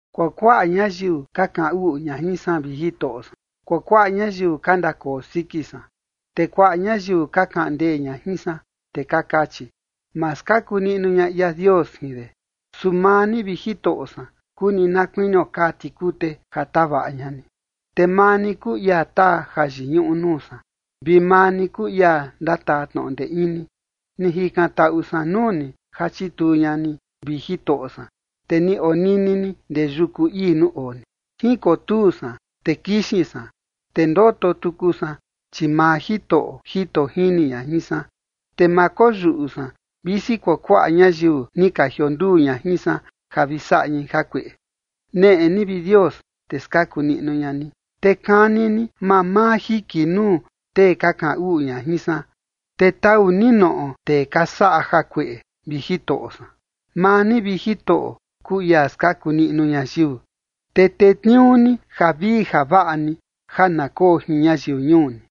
Kuakuaꞌa ñayiu ka kaꞌan uꞌu ña jin san, vi Jitoꞌo san. Kuakuaꞌa ñayiu ka ndakoo siki san. Te kuaꞌa ñayiu ka kaꞌan ndee ña jin san, te ka kachi: “Ma skaku niꞌnu ña ia Dios jin de”. Su maa ni, vi Jitoꞌo san, kuu ni na kuinio kaa tikute ja tavaꞌa ña ni, te maa ni kuu ia taa jayiñuꞌu nuu san, vi maa ni kuu ia ndataa tnoꞌo ndee ini. Ni jikantaꞌu san nuu ni ja chituu ña ni, vi Jitoꞌo san, te ni onini ni ndee yuku ii nuu oo ni. Jinkotuu san, te kixin san, te ndoto tuku san, chi maa Jitoꞌo jito jini ña jin san. Te ma koyuꞌu san visi kuakuaꞌa ñayiu ni ka jionduu ña jin san, ja vi saꞌa ñai jakueꞌe. Neꞌe ni, vi Dios, te skaku niꞌnu ña ni, te kani ni mamaa jiki nuu tee ka kaꞌan uꞌu ña jin san, te taꞌu ni noꞌo tee ka saꞌa jakueꞌe, vi Jitoꞌo san. Maa ni, vi Jitoꞌo, kuu ia skaku niꞌnu ñayiu, te tetniuu ni javii javaꞌa ni ja na koo jin ñayiu ñuu ni.